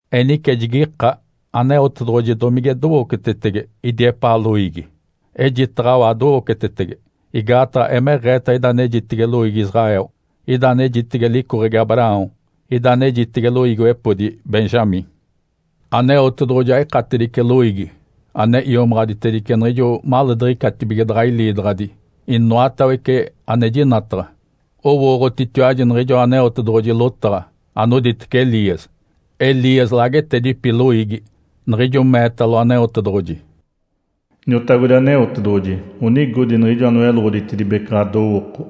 Enice jigika, “Aneotedoɡ̶oji domige dowocetetege idi epaa loiigi?” Ejitaɡ̶awa adowocetetege. Igaataɡ̶a emeɡ̶eeta ida anejitege loiigi Israel. Ijo anejitege Icoɡ̶egi Abraão, ida anejitege loiigiwepodi Benjamim. Aneotedoɡ̶oji aikatedice loiigi ane iomaɡ̶aditedice niɡ̶ijo maleediɡ̶icatibige daɡ̶a iliidaɡ̶adi inoatawece ane jinataɡ̶a. Owooɡ̶otitiwaji niɡ̶ijoa Aneotedoɡ̶oji lotaɡ̶a anoditece Elias. Elias laagetedipi loiigi niɡ̶ijo meetalo Aneotedoɡ̶oji, “Iniotagodi Aneotedoɡ̶oji. Onigodi niɡ̶ijo anoyeloɡ̶oditedibece ɡ̶adowooko,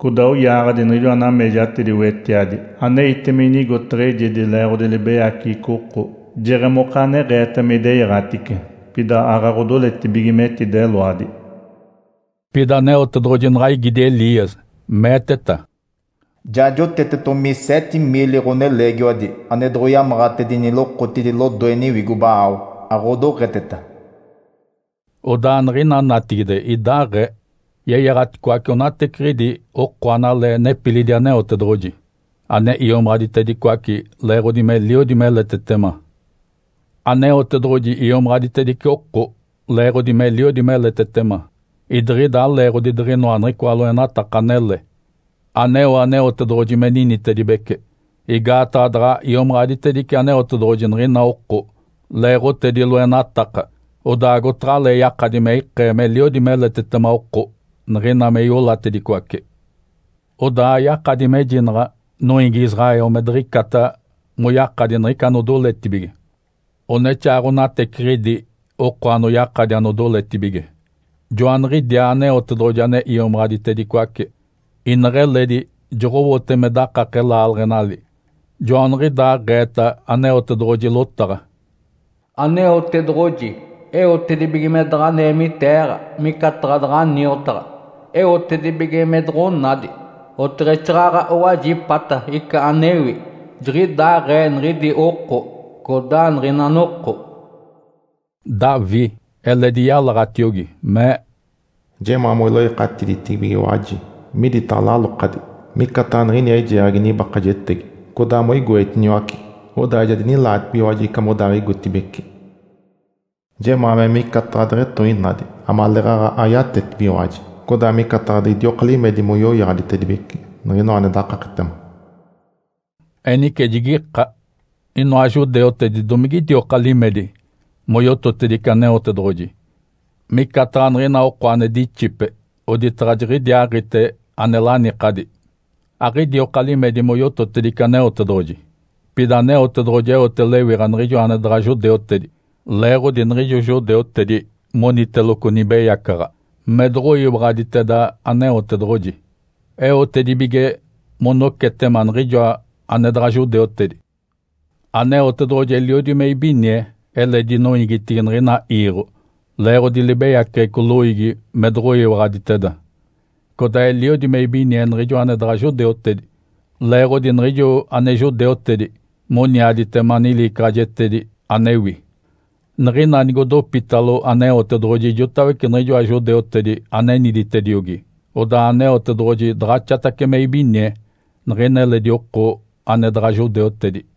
codaa oyaaɡ̶adi niɡ̶ijoa nameejatedi wetiadi aneite me inigotaɡ̶a eijedi leeɡ̶odi libeyaceɡ̶eco oko. Jeɡ̶emokaaneɡ̶eeta me ideyaɡ̶atice, pida aaɡ̶aɡ̶odoletibige metideloadi.” Pida Aneotedoɡ̶oji naɡ̶a igidi Elias, meeteta, “Ja jotetetomi seete miili ɡ̶oneleegiwadi ane doɡ̶oyamaɡ̶atedini lokotidi lodoe niwigo Baal, aɡ̶odoɡ̶eteta” Odaa niɡ̶ina natigide idaaɡ̶ee. Yeyaɡ̶aticoace onateciɡ̶idi oko analee nepilidi Aneotedoɡ̶oji, ane iomaɡ̶aditedicoace leeɡ̶odi meliodi meletetema. Aneotedoɡ̶oji iomaɡ̶aditedice oko leeɡ̶odi meliodi meletetema, idiɡ̶ida aleeɡ̶odi diɡ̶inoa niɡ̶icoa loenataka anele aneo Aneotedoɡ̶oji me ninitedibece. Igaataɡ̶a daɡ̶a iomaɡ̶aditedice Aneotedoɡ̶oji niɡ̶ina oko leeɡ̶otedi loenataka, odaa agotaɡ̶alee yakadi me ikee meliodi meletetema oko niɡ̶ina me iolatedicoace. Odaa yakadi mejinaɡ̶a noiigi Israel me diɡ̶icata moyakadi niɡ̶ica anodoletibige. Onexaaɡ̶onateciɡ̶idi oko anoyakadi anodoletibige, joaniɡ̶idiaa Aneotedoɡ̶oji ane iomaɡ̶aditedicoace. Ineɡ̶eledi joɡ̶owote me dakake laaleɡ̶enali. Joaniɡ̶idaaɡ̶eeta Aneotedoɡ̶oji lotaɡ̶a, “Aneotedoɡ̶oji eotedibige me daɡ̶a neemiteeɡ̶a micataɡ̶a daɡ̶a niotaɡ̶a, eotedibige me doɡ̶onadi, oteɡ̶exaaɡ̶aɡ̶a owajipata ica anewi. Jiɡ̶idaaɡ̶ee niɡ̶idi oko codaa niɡ̶ina noko.” Davi eledi yalaɡ̶atiogi, mee, “Jemaa moiloikatiditibigiwaji miditaɡ̶a lalokadi, micataɡ̶a niɡ̶ini eijeeɡ̶agi nibakajetegi, codaa moigoetiniwace, odaa ja dinilaatibigiwaji ica modaaɡ̶igotibeci. Jemaa me micataɡ̶a deɡ̶etoinadi amaleeɡ̶aɡ̶a ayatetibigiwaji, codaa micataɡ̶a diɡ̶idioka limedi moyoyaɡ̶aditedibece niɡ̶inoa ane dakaketema.” Enice, jigika, “Inoa judeutedi, domigidioka limedi moyototedice Aneotedoɡ̶oji, micataɡ̶a niɡ̶ina oko ane dixipe oditaɡ̶a jiɡ̶idiaaɡ̶ite ane lanikadi?” Aɡ̶idioka limedi moyototedice Aneotedoɡ̶oji. Pida Aneotedoɡ̶oji eote lewiɡ̶a niɡ̶ijo ane daɡ̶a judeutedi leeɡ̶odi niɡ̶ijo judeutedi moniteloco nibeyacaɡ̶a me doɡ̶oyiwaɡ̶aditeda Aneotedoɡ̶oji, eotedibige monocetema niɡ̶ijoa ane daɡ̶a judeutedi. Aneotedoɡ̶oji eliodi me ibinie eledi noiigitigi niɡ̶ina iiɡ̶o leeɡ̶odi libeyaceɡ̶eco loiigi me doɡ̶oyiwaɡ̶aditeda. Codaa eliodi me ibinie niɡ̶ijo ane daɡ̶a judeutedi, leeɡ̶odi niɡ̶ijo ane judeutedi moniaditema niliicaɡ̶ajetedi anewi. Niɡ̶ina nigodopitalo Aneotedoɡ̶oji ijotawece niɡ̶ijoa judeutedi aneniditediogi, odaa Aneotedoɡ̶oji daɡ̶axatace me ibinie niɡ̶ina eledi oko ane daɡ̶a judeutedi.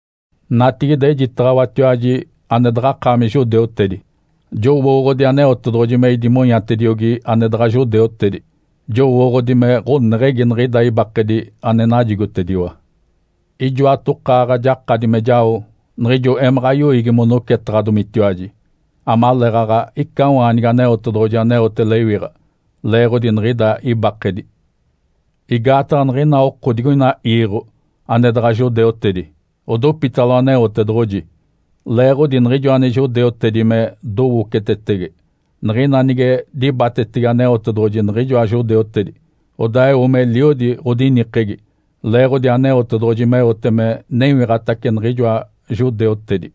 Natigide ejitaɡ̶awatiwaji ane daɡ̶akaami judeutedi. Jowooɡ̶odi Aneotedoɡ̶oji me idimonyatediogi ane daɡ̶a judeutedi. Jowooɡ̶odi me ɡ̶oneɡ̶egi niɡ̶ida ibakedi ane najigotediwa. Ijoatokaaɡ̶a jakadi me jao niɡ̶ijo emaɡ̶a yoiigi monocetaɡ̶adomitiwaji, amaleeɡ̶aɡ̶a icawaanigi Aneotedoɡ̶oji aneote lewiɡ̶a leeɡ̶odi niɡ̶ida ibakedi. Igaataɡ̶a niɡ̶ina oko digoina iiɡ̶o ane daɡ̶a judeutedi odopitalo Aneotedoɡ̶oji leeɡ̶odi niɡ̶ijo ane judeutedi me dowocetetege. Niɡ̶ina nige dibatacetege Aneotedoɡ̶oji niɡ̶ijoa judeutedi, odaa eo meliodi ɡ̶odinikegi leeɡ̶odi Aneotedoɡ̶oji meote me newiɡ̶atace niɡ̶ijoa judeutedi.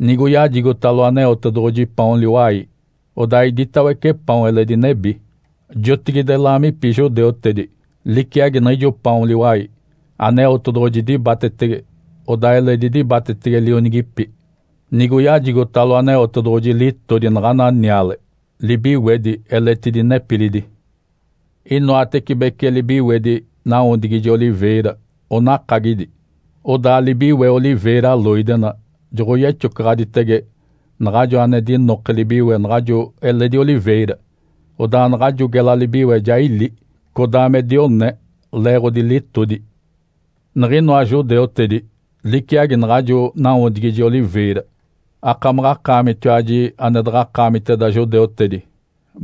Nigoyajigotalo Aneotedoɡ̶oji paon liwai, odaa iditawece paon eledi nebi. (Jotigide laamipi judeutedi liciagi niɡ̶ijo paon liwai. Aneotedoɡ̶oji dibatetege, odaa eledi dibatetege lionigipi). Nigoyajigotalo Aneotedoɡ̶oji litodi naɡ̶ana niale, libiwedi eletidi nepilidi. Inoatecibece libiwedi nawodigije oliveira onakagidi. Odaa libiwe oliveira loidena joɡ̶oyexocaɡ̶aditege naɡ̶ajo ane dinoke libiwe naɡ̶ajo eledi oliveira. Odaa naɡ̶ajo gela libiwe ja ili, codaa me dione, leeɡ̶odi litodi. Niɡ̶inoa judeutedi liciagi naɡ̶ajo nawodigije oliveira. Akamaɡ̶akaamitiwaji ane daɡ̶akaamiteda judeutedi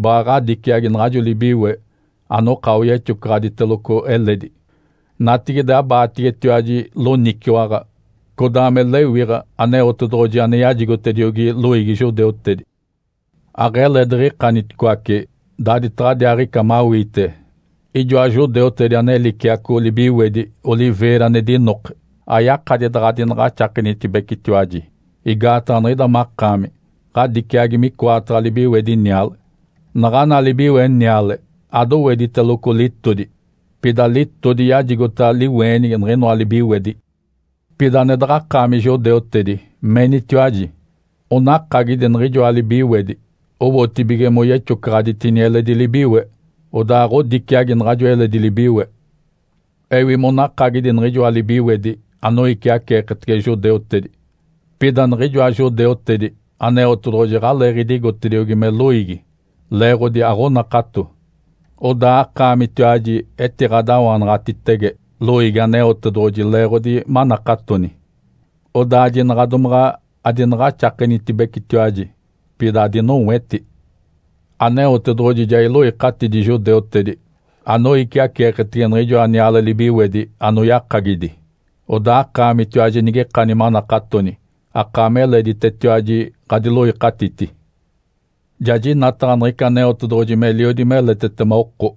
baɡ̶a ɡ̶adiciagi naɡ̶ajo libiwe anoka oyexocaɡ̶aditeloco eledi. Natigide abaategetiwaji loniciwaɡ̶a codaa me lewiɡ̶a Aneotedoɡ̶oji ane yajigotediogi loiigi judeutedi. Aɡ̶ele diɡ̶ikaniticoace, daaditaɡ̶adiaaɡ̶ica mawiite ijoa judeutedi ane liciaco libiwedi oliveira ane dinoke. Ayakadi daɡ̶adinaɡ̶axakenitibecetiwaji, igaataɡ̶a niɡ̶ida makaami ɡ̶adiciagi micoataɡ̶a libiwedi niale. Naɡ̶ana libiwe niale adowediteloco litodi, pida litodi yajigota liweenigi niɡ̶inoa libiwedi. Pida ane daɡ̶akaami judeutedi menitiwaji, “Onakagidi niɡ̶ijoa libiwedi owotibige moyexocaɡ̶aditini eledi libiwe. Odaa ɡ̶odiciagi naɡ̶ajo eledi libiwe.” Ewi monakagidi niɡ̶ijoa libiwedi anoiciaceeketege judeutedi. Pida niɡ̶ijoa judeutedi Aneotedoɡ̶oji aɡ̶aleeɡ̶eetediogi me loiigi leeɡ̶odi aɡ̶onakato, odaa akaamitiwaji etiɡ̶adawanaɡ̶atitege loiigi Aneotedoɡ̶oji leeɡ̶odi manakatoni. Odaa jinaɡ̶a domaɡ̶a adinaɡ̶axakenitibecetiwaji, pida adinoweti. Aneotedoɡ̶oji ja iloikatidi judeutedi, anoiciaceeketege niɡ̶ijoa niale libiwedi anoyakagidi. Odaa akaamitiwaji nigikani manakatoni, akaami eleditetiwaji ɡ̶adiloikatiti. Ja jinataɡ̶a niɡ̶ica Aneotedoɡ̶oji meliodi meletetema oko,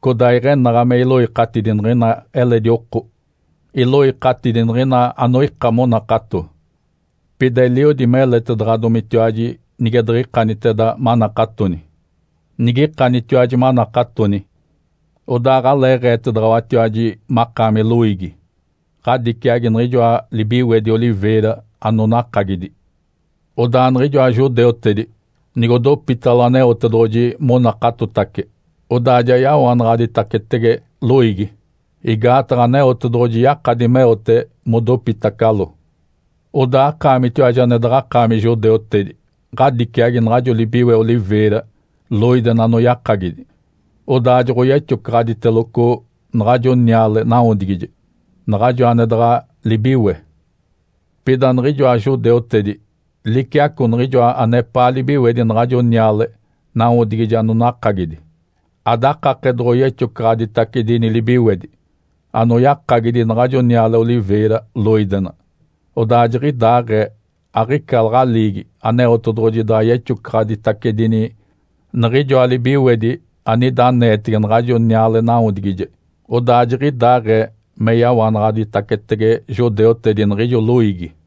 codaa iɡ̶enaɡ̶a me iloikatidi niɡ̶ina eledi oko. Iloikatidi niɡ̶ina anoika monakato, pida eliodi meletedaɡ̶adomitiwaji nige diɡ̶ikaniteda manakatoni. Nigikanitiwaji manakatoni, odaa aɡ̶aleeɡ̶eetedaɡ̶awatiwaji makaami loiigi, ɡ̶adiciagi niɡ̶ijoa libiwedi oliveira anonakagidi. Odaa niɡ̶ijoa judeutedi, nigodopitalo Aneotedoɡ̶oji monakatotace, odaa ja yawanaɡ̶aditacetege loiigi, igaataɡ̶a Aneotedoɡ̶oji yakadi meote modopitacalo. Odaa akaamitiwaji ane daɡ̶akaami judeutedi, ɡ̶adiciagi naɡ̶ajo libiwe oliveira loidena anoyakagidi, odaa joɡ̶oyexocaɡ̶aditeloco naɡ̶ajo niale nawodigije, naɡ̶ajo ane daɡ̶a libiwe. Pida niɡ̶ijoa judeutedi liciaco niɡ̶ijoa anepaa libiwedi naɡ̶ajo niale nawodigije anonakagidi. Adakake doɡ̶oyexocaɡ̶aditacedini libiwedi anoyakagidi naɡ̶ajo niale oliveira loidena. Odaa jiɡ̶idaaɡ̶ee aɡ̶ica laɡ̶aliigi Aneotedoɡ̶oji daɡ̶a yexocaɡ̶aditacedini niɡ̶ijoa libiwedi anida aneetege naɡ̶ajo niale nawodigije, odaa jiɡ̶idaaɡ̶ee me yawanaɡ̶aditacetege judeutedi niɡ̶ijo loiigi.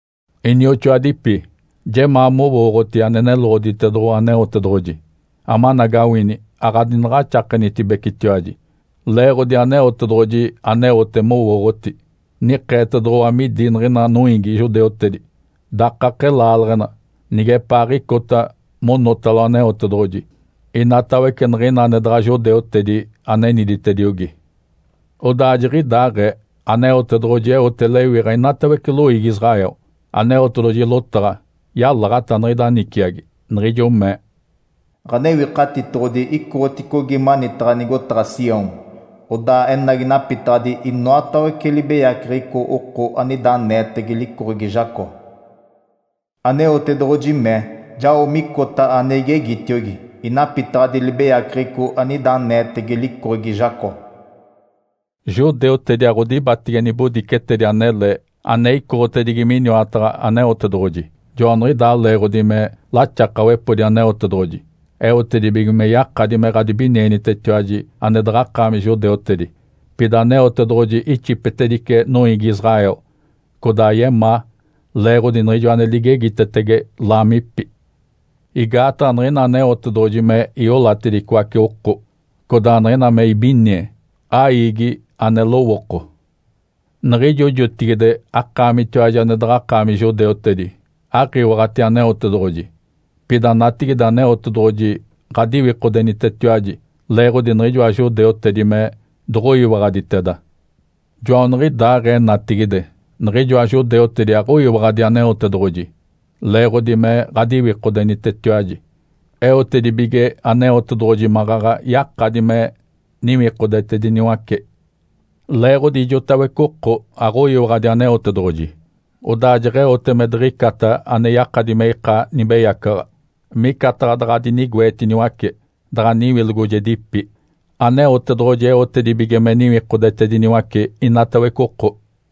Inioxoadipi. Jemaa mowooɡ̶oti ane neloɡ̶oditedoɡ̶owa Aneotedoɡ̶oji, amanagawini aɡ̶adinaɡ̶axakenitibecetiwaji leeɡ̶odi Aneotedoɡ̶oji aneote mowooɡ̶oti. Nikeetedoɡ̶owa midi niɡ̶ina noiigi judeutedi dakake laaleɡ̶ena nigepaaɡ̶icota monotalo Aneotedoɡ̶oji inatawece niɡ̶ina ane daɡ̶a judeutedi aneniditediogi. Odaa jiɡ̶idaaɡ̶ee, Aneotedoɡ̶oji eote lewiɡ̶a inatawece loiigi Israel. Aneotedoɡ̶oji lotaɡ̶a yalaɡ̶ata niɡ̶ida niciagi, niɡ̶ijo mee, “Ǥanewikatitoɡ̶odi icoɡ̶oticogi manitaɡ̶a nigotaɡ̶a Sião, odaa enagi napitaɡ̶adi inoatawece libeyaceɡ̶eco oko anida aneetege licoɡ̶egi Jacó. Aneotedoɡ̶oji mee, ‘Jao micota ane igegitiogi, inapitaɡ̶adi libeyaceɡ̶eco anida aneetege licoɡ̶egi Jacó.’” Judeutedi aɡ̶odibatege nibodicetedi anele ane icoɡ̶otedigi miniwataɡ̶a Aneotedoɡ̶oji. Joaniɡ̶idaa leeɡ̶odi me laxakawepodi Aneotedoɡ̶oji eotedibige me yakadi me ɡ̶adibinienitetiwaji ane daɡ̶akaami judeutedi. Pida Aneotedoɡ̶oji ixipetedice noiigi Israel, codaa yemaa leeɡ̶odi niɡ̶ijo ane ligegitetege laamipi. Igaataɡ̶a niɡ̶ina Aneotedoɡ̶oji me iolatedicoace oko, codaa niɡ̶ina me ibinie, aiigi ane lowooko. Niɡ̶ijo jotigide akaamitiwaji ane daɡ̶akaami judeutedi aɡ̶iwaɡ̶ati Aneotedoɡ̶oji. Pida natigide Aneotedoɡ̶oji ɡ̶adiwikodenitetiwaji leeɡ̶odi niɡ̶ijoa judeutedi me doɡ̶oyiwaɡ̶aditeda. Joaniɡ̶idaaɡ̶ee natigide niɡ̶ijoa judeutedi aɡ̶oyiwaɡ̶adi Aneotedoɡ̶oji leeɡ̶odi me ɡ̶adiwikodenitetiwaji. Eotedibige Aneotedoɡ̶oji maɡ̶aɡ̶a yakadi me niwikodetediniwace. Leeɡ̶odi ijotawece oko aɡ̶oyiwaɡ̶adi Aneotedoɡ̶oji, odaa jeɡ̶eote me diɡ̶icata ane yakadi me ika nibeyacaɡ̶a, micataɡ̶a daɡ̶a dinigoetiniwace, daɡ̶a niwilogojegipi. Aneotedoɡ̶oji eotedibige me niwikodetediniwace inatawece oko.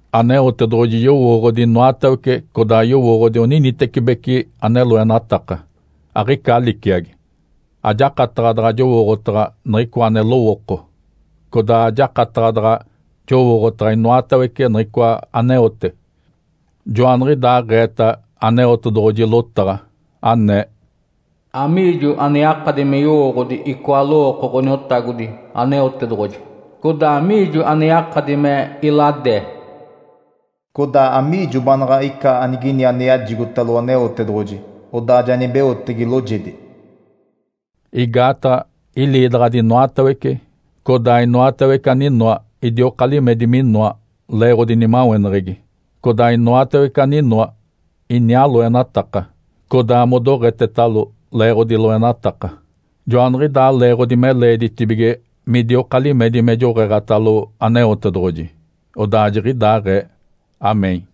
Aneotedoɡ̶oji yowooɡ̶odi inoatawece, codaa yowooɡ̶odi oninitecibeci ane loenataka. Aɡ̶ica liciagi. Ajakataɡ̶a daɡ̶a jowooɡ̶otaɡ̶a niɡ̶icoa ane lowooko, codaa ajakataɡ̶a daɡ̶a jowooɡ̶otaɡ̶a inoatawece niɡ̶icoa aneote. Joaniɡ̶idaaɡ̶eeta Aneotedoɡ̶oji lotaɡ̶a, anee, “Amiijo ane yakadi me yowooɡ̶odi icoa lowooko Ǥoniotagodi Aneotedoɡ̶oji? Codaa amiijo ane yakadi me iladee? Codaa amiijo baanaɡ̶a ica anigini ane yajigotalo Aneotedoɡ̶oji, odaa ja nibeotege loojedi?” Igaataɡ̶a iliidaɡ̶adi inoatawece, codaa inoatawece aninoa idioka limedi minoa leeɡ̶odi nimaweneɡ̶egi, codaa inoatawece aninoa, iniaa loenataka, codaa modoɡ̶etetalo leeɡ̶odi loenataka. Joaniɡ̶idaa leeɡ̶odi me leeditibige midioka limedi me joɡ̶eeɡ̶atalo Aneotedoɡ̶oji. Odaa jiɡ̶idaaɡ̶ee. (Amém).